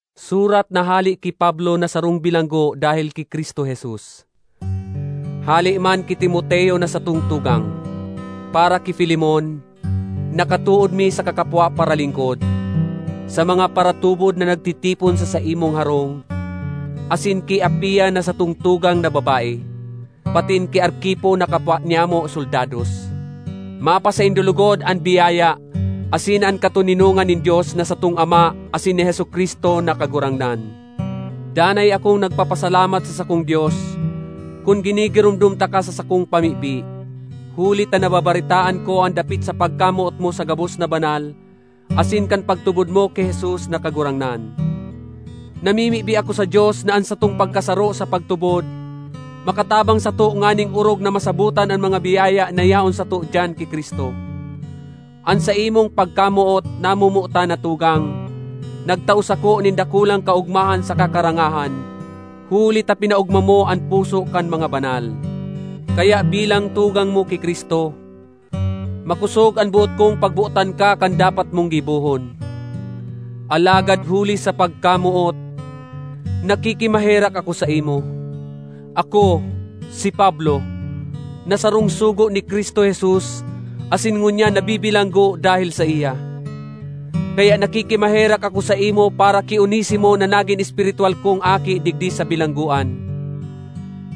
Surat na hale ki Pablo na sarong bilanggo dahel ki Cristo Jesus; hale man ki Timoteo na satong tugang. Para ki Filemon, na katood mi saka kapwa paralingkod, sa mga paratubod na nagtitipon sa saimong harong, asin ki Apia na satong tugang na babae, patin ki Arquipo na kapwa nyamo soldados: Mapasaindo logod an biyaya asin an katoninongan nin Dios na satong Ama asin ni Jesu-Cristo na Kagurangnan. Danay akong nagpapasalamat sa sakong Dios, kun ginigiromdom taka sa sakong pamibi, huli ta nababaretaan ko an dapit sa pagkamoot mo sa gabos na banal asin kan pagtubod mo ki Jesus na Kagurangnan. Namimibi ako sa Dios na an satong pagkasaro sa pagtubod makatabang sato nganing orog na masabotan an mga biyaya na yaon sato diyan ki Cristo. An saimong pagkamoot, namomotan na tugang, nagtao sako nin dakulang kaogmahan saka karangahan, huli ta pinaogma mo an puso kan mga banal. Kaya bilang tugang mo ki Cristo, makosog an boot kong pagbotan ka kan dapat mong gibohon, alagad huli sa pagkamoot, nakikimaherak ako saimo—ako, si Pablo, na sarong sugo ni Cristo Jesus asin ngunyan nabibilanggo dahel saiya. Kaya nakikimaherak ako saimo para ki Onesimo na nagin espiritwal kong aki digdi sa bilanggoan.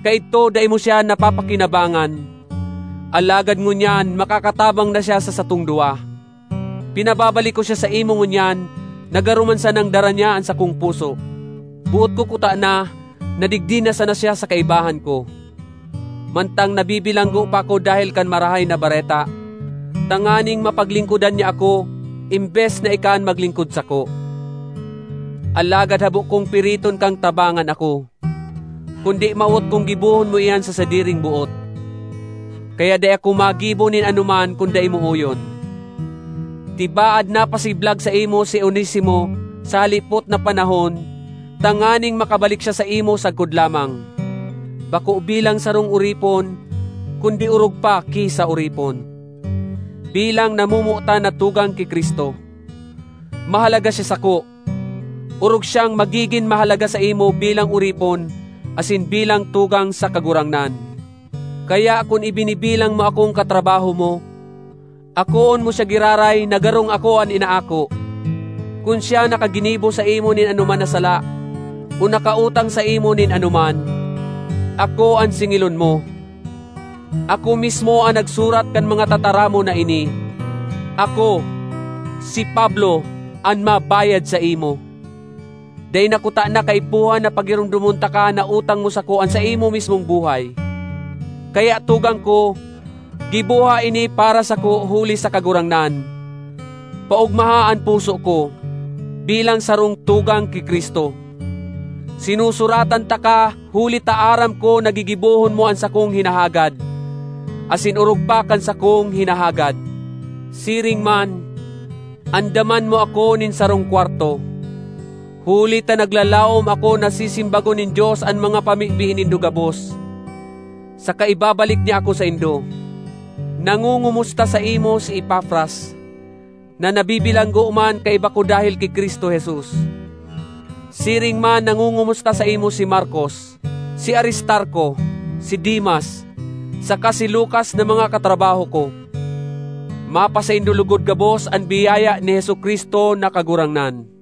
Kaidto dai mo siya napapakinabangan, alagad ngunyan makakatabang na siya sa satong duwa. Pinababalik ko siya saimo ngunyan na garo man sanang dara niya an sakong puso. Boot ko kutana na digdi na sana siya sa kaibahan ko, mantang nabibilanggo pa ako dahel kan Marahay na Bareta, tanganing mapaglingkodan niya ako embes na ika an maglingkod sako. Alagad habo kong piriton kang tabangan ako; kundi mawot kong gibohon mo iyan sa sadiring boot. Kaya dai ako magibo nin anoman kun dai mo oyon. Tibaad napasiblag saimo si Onesimo sa halipot na panahon tanganing makabalik siya saimo sagkod lamang, bako bilang sarong oripon kundi orog pa ki sa oripon—bilang namomotan na tugang ki Cristo. Mahalaga siya sako! Orog siyang magigin mahalaga saimo bilang oripon asin bilang tugang sa Kagurangnan! Kaya kun ibinibilang mo akong katrabaho mo, akoon mo siya giraray na garong ako an inaako. Kun siya nakaginibo saimo nin anoman na sala o nakautang saimo nin anoman, ako an singilon mo. Ako mismo an nagsurat kan mga tataramon na ini: Ako, si Pablo, an mabayad saimo. (Dai na kutana kaipuhan na pagiromdomon taka na utang mo sako an saimo mismong buhay.) Kaya, tugang ko, giboha ini para sako huli sa Kagurangnan; paogmaha an puso ko, bilang sarong tugang ki Cristo! Sinusuratan taka huli ta aram ko na gigibohon mo an sakong hinahagad—asin orog pa kan sakong hinahagad. Siring man, andaman mo ako nin sarong kwarto, huli ta naglalaom ako na sisimbagon nin Dios an mga pamibi nindo gabos, saka ibabalik niya ako saindo. Nangongomusta saimo si Epafras, na nabibilanggo man kaiba ko dahel ki Cristo Jesus. Siring man nangongomusta saimo si Markos, si Aristarco, si Demas, saka si Lukas na mga katrabaho ko. Mapasaindo logod gabos an biyaya ni Jesu-Cristo na Kagurangnan.